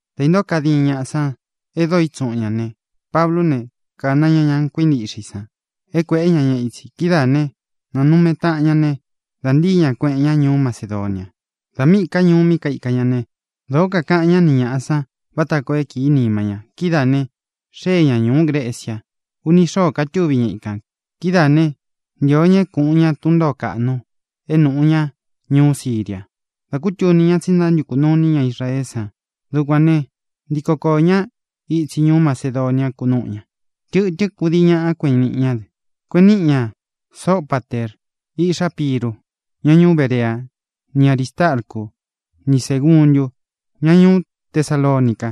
Dā intóo kadin ñaꞌa sán e dóo itsuꞌun ña ne, Pablú ne, kāna ña ña kuíntiꞌxe i san é kuēꞌe ña ña itsi. Kidáā né, nānume taꞌan ña ne, dā ntíi ña, kueꞌen ña ñuú Macedonia. Dā míꞌī ká ñuu mí kaika ña ne, dōo kakaꞌan ñá ni ñāꞌa san vata koo é kīí nima ña. Kidáā ne, xée ña ñūú Grecia. Uni xóō katúvi ña ikān. Kidáā né, ntīo ña é kuꞌun ña tun ntōó kaꞌnu é nūꞌu ñá ñuú Síria dá kútuni ña tsí ntántukū nuu iní ña Israeé san. Dukuān ne, ntíko koō ñá itsi ñuú Macedonia, kunúꞌu ña. Tɨtɨ́n kudii ñaꞌa kueꞌen niꞌi ñá dɨ. Kueꞌen níꞌi ña Sopater, iꞌxá Piru, ña ñuú Berea; ni Arīstarcu ni Ségundu, ña ñuú Tesalonica;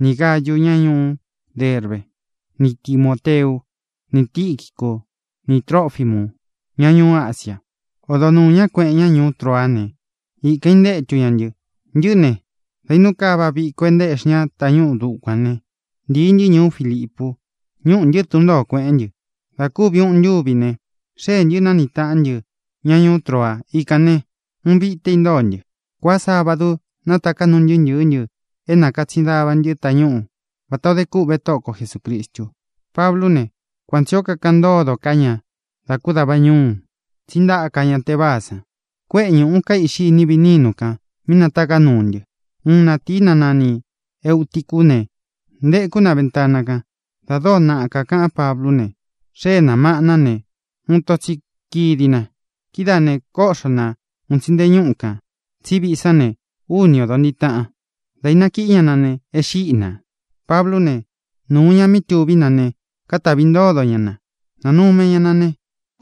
nī Gáyu, ña ñuú Derbe; ni Timōteu; ni Tīquicu ni Trófimu, ña ñuú Asia. Odo nuū ñá, kueꞌen ña ñuú Troa ne, ikān intétu ña ntɨ. Ntɨꞌɨ́ ne, dā inú kava viko é ntaéꞌxi ña tañúꞌu dukuān ne, ntīi ntɨ́ ñuú Filipu. Ñúꞌū ntɨ́ tun ntōo, kuéꞌen ntɨ. Dā kúvi ūꞌun ntúvi ne, xeé ntɨ, nāniꞌi taꞌan ntɨ́ ña ñuú Troa. Ikān ne, uun vité intóo ntɨ. Kuaá sabadu nátaká nuu ntɨɨ́ ntɨ̄ɨ́ ntɨ é nakatsin dava ntɨ́ tañúꞌu, vatā o dé kûꞌvé Tóꞌo ko Jesūcristu. Pablú ne, kuan tsī ó kakaꞌan ntódo ká ña dá ku davā ñúu, tsí ntaka ñá teváa san. Kuéꞌe ñūꞌu kaíꞌxi iní viꞌi nínu kān mí nátaká nuu ntɨ. Uun natīi, ná nani Eūticu ne, ntéku na ventana kan. Dā dóo naꞌa kakaꞌán Pablú ne, xée nā maꞌna ne, uun ito tsi kídi na. Kidáā ne, kóꞌxo na un tsi nte ñúꞌu kān. Tsí viꞌi sán ne, úni ōdo ntiꞌi taꞌan. Dā ínakiꞌí ña na ne, e xíꞌi nā. Pablú ne, nūu ña mí tuví na ne, katavi ntódo ña na, nánume ña na ne,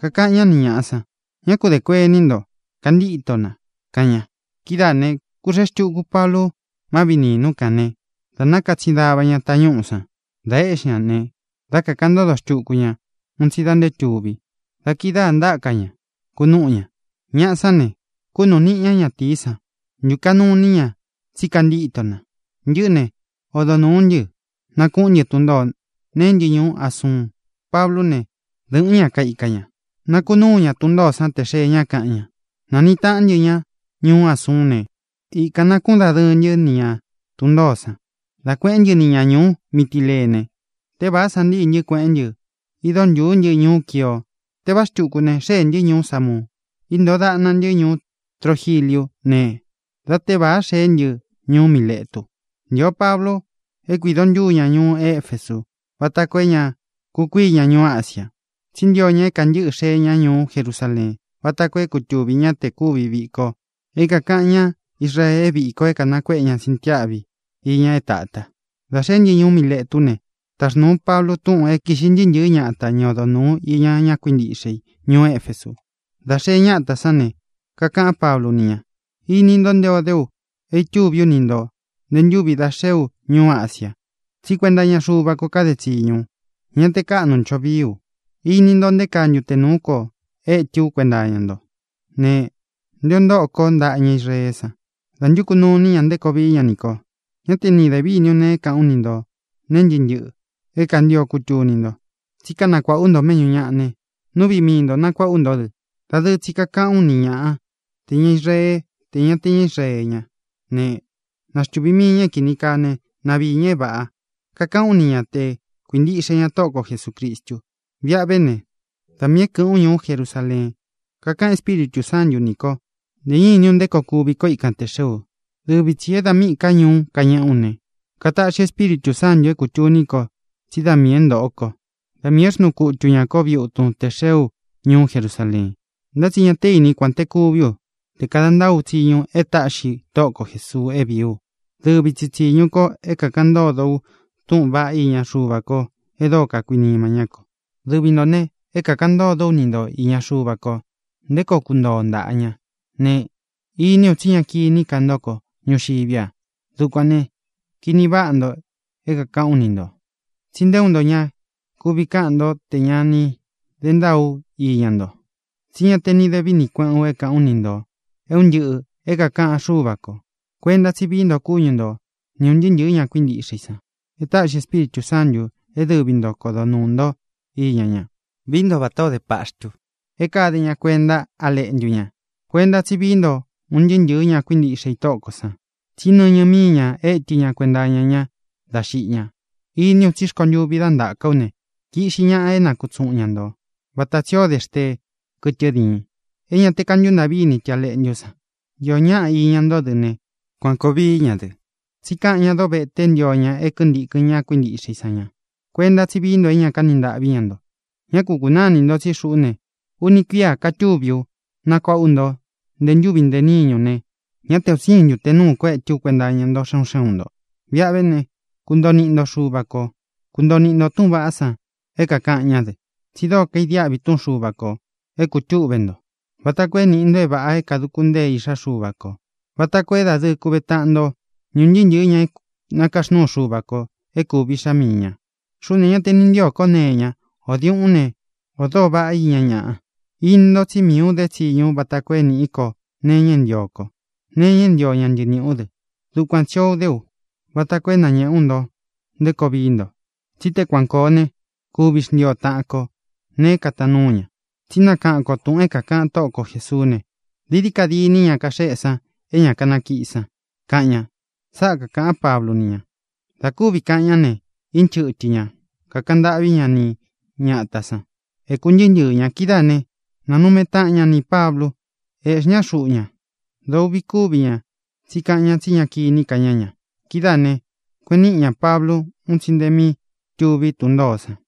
kakaꞌan ñá ni ñāꞌa san: —Ñá ku dē kuení nto. ¡Kantíto na! —kaꞌan ña. Kidáā ne, kúxēe xtúku Pablu má viꞌī nínu kān ne, dā nákatsin dava ña tañúꞌū san, da eꞌxí ña ne, dá kakāꞌan ntódo xtuku ña un tsi da nté tuvi. Da kidáā ntáka ña, kunúꞌu ña. Ñaꞌa sán ne, kunuꞌu níꞌi ña natīí san, ntūkaꞌnu iní ña tsí kantíto na. Ntɨꞌɨ́ ne, odo nūú ntɨ, nakuꞌún ntɨ tun ntōo, ñéꞌē ntɨ́ ñuú Asuun. Pablú ne, dɨ̄ꞌɨ́n ña kaika ña. Nakunúu ña tun ntōó san té xee ña, káꞌan ña. Nāniꞌi taꞌán ntɨ ña ñuú Asuún ne, ikān nakúꞌun dadɨɨ ntɨ́ ni ña tun ntōó san, dá kuēꞌén ntɨ ni ña ñūú Mitilene. Tévāá san ntíi ntɨ́, kueꞌén ntɨ, ído ntūú ntɨ ñuú Quio. Tévāá xtuku ne, xéē ntɨ́ ñuú Samu. Íntōo daꞌna ntɨ́ ñuú Trogiliu ne, dá tevāa xeé ntɨ ñuú Miletu. Ntio Pablu é kuīdo ntúu ña ñuú Efesu váta koo é ña kukuíi ña ñuu Ásiā, tsí ntio ña é kantɨ́ꞌɨ xee ña ñuú Jerusaleen, váta koo é kutuvī ñá te kūvi viko é kākaꞌan ñá Israee é viko é kanakuéꞌe ña sintiáꞌvi iña é tāta. Dā xeé ntɨ ñuú Miletú ne, taxnūú Pablu túꞌūn é kīꞌxi ntɨɨ́ ntɨ̄ɨ́ ñata, ña odo nūú iña ña kuíntiꞌxe i ñuú Efesu. Dā xee ñátā sán ne, kakaꞌán Pablu ni ña: —Īni nto nté ō dé u é tuví u ni ntō nté ntūvi dá xee ú ñuu Ásia ā. Tsí kuenta iña Xúva kō kade tsiñu u. Ñá te kāꞌnu ncho vií u. Īni nto nté kaa ntute nūú ko étɨ ú kuenta iña ntó ne, nté ō ntóꞌo kó ntaꞌa ña Israeé san dā ntúku nuu iní ña nté koo vií ña nī ko. Ñá te ni dē víni u é kāꞌán u ni ntō nee ntɨ́ꞌɨ ntɨꞌɨ é kāntio é kūtuni nto. Tsí kanakuāꞌá u nto méꞌñū ñaꞌa ne, nú viꞌi mii nto nakuāꞌá u nto dɨ. Dadɨɨ tsi kakaꞌán u ni ñāꞌa, te ñá Israee, te ña é ña te ña Israee ñá ne, na xtuvī mii ña é kīni kaá ne, na viī ña é vāꞌa. Kakaꞌán u ni ña te kuīntiꞌxe ña Tóꞌo ko Jesūcristu. Viꞌa ve ne, da miī é kɨ̄ꞌɨ́n u ñuú Jerusaleen, kakáꞌan Espíritū Sántu nī ko. Ntē ñá īní u nté koo kuvi ko íkan tē xee u. Dɨvi tsī é dā míꞌī ká ñuú kañeꞌé u ne, kataꞌxi Espíritū Sántū é kūtuní ko tsí da miī é ntōꞌo kó, da miī é xnuu kutu ñā kó viꞌi utun te xeé u ñuú Jerusaleen. Ntá tsi ñā té ini kuān té kuví u, te kāda ntáa ú tsiñu e táꞌxi Tóꞌo ko Jēsuu é vīí u: dɨvi tsi tsīñu ko é kākaꞌan ntódo u túꞌūn vaꞌá iña Xuva ko e dóo kakuinima ñá kō. ʼDɨvi ntō ne, é kākaꞌan ntódo ú ni nto īña Xuva ko, nté koo kuntoo o ntāꞌa ñá ne, iní u tsí ña kiní ka nto kó ñuxiví a. Dukuān ne, kini váꞌa nto é kākaꞌán u ni ntō, tsí nté uun nto ña kuvi káꞌan nto te ña ni de ntáa ú iña nto. Tsí ña te ni dé vini kueꞌén u é kāꞌán u ni ntō é un ntɨꞌɨ̄ é kākaꞌan Xúva kō. Kuenta tsí vií ntō kúñu nto ni ūn ntɨɨ́ ntɨ̄ɨ́ ña kuíntiꞌxe i san é táꞌxi Espíritū Sántū é dɨvi nto kodo nuū ntó iña ña. Vií nto vatā ó de paxtu é kade ña kuenta á leꞌntu ña. Kuenta tsí vií nto un ntɨɨ́ ntɨ̄ɨ́ ña kuíntiꞌxe i Tóꞌo kō san, tsí nɨñɨ míi ña étɨ ña kuenta iña ña dá xiꞌi ña. Iní u tsí rkontuvi dá ntaka ú ne, kiꞌxi ñaꞌa é nakutsuꞌun ña nto, vata tsī ó de xteé, kɨtɨ diin, é ña te kántuntāꞌví ini tɨ a leꞌntú san. Iō ñáꞌa iña ntó dɨ ne, kuān koo vií ña dɨ. Tsí kaꞌan ñá dovete é ntio ña é kintīkɨn ña kuíntiꞌxe i sán ña. Kuenta tsí vií nto é ña kani ntaꞌví ña nto. Ñá ku kūnáa inī ntó tsí xuꞌú ne, uni kuía katúvi u, nakuáꞌa ú nto nte ntúvi nte níñu ne, ñá te un siin ntute nūú ko étɨ ú kuenta iña ntó xe un xé un ntō. ʼViꞌa ve né, kuntoo niꞌi nto Xuva kō. Kuntoo niꞌi nto tūꞌun vaꞌá san é kākaꞌan ñá dɨ. Tsi dóo kaidiáꞌvi túꞌun Xuva kō é kūtúꞌve nto, vata koo é nīꞌi nto é vāꞌa é kāduku ntée iꞌxá Xuva kō, vata koo é dadɨɨ kuve taꞌan nto ni ūn ntɨɨ́ ntɨ̄ɨ́ ña é nakaxnúu Xuva kō é kūvi iꞌxá mii ñā. Xuꞌú ne, ñá tē ni ntío ko nee iña, ō diuꞌún ne, ō doo váꞌa iña ñaꞌa. Ini nto tsí miī ú dé tsiñu ú vata koo é nīꞌí ko nee iña é ntio kó, nee iña é ntio ña ntɨɨ niꞌī ú dɨ. Dukuan tsī o dé u vata koo é nañēꞌé u nto nté koo vií nto. Tsí te kuan kōo ne, kuvi xntii o taꞌan kō nee é kataan núu ña. Tsí nakaꞌan ko tūꞌun é kākaꞌan Tóꞌo ko Jēsuú ne: “Dií dií ka dîní ña kaxeꞌé san é ña kanakíꞌi san”, kaꞌan ña. —Sáꞌā kaꞌán Pablu ni ña. Dā kúvi kaꞌan ñá ne, ínchɨtɨ ñā, kakaꞌan ntâꞌví ña ni ñatā san. Ēku ntɨɨ́ ntɨɨ̄ ña. Kidáā né, nanume taꞌan ña nī Pablu, eꞌxí ña xuꞌu ña. Dōo uꞌvi kúvi ña tsí kakaꞌan ña tsí ña kiní ka ña ña. Kidáā ne, kueꞌen níꞌi ñā Pablu un tsi nte mi túvi tun ntōó san.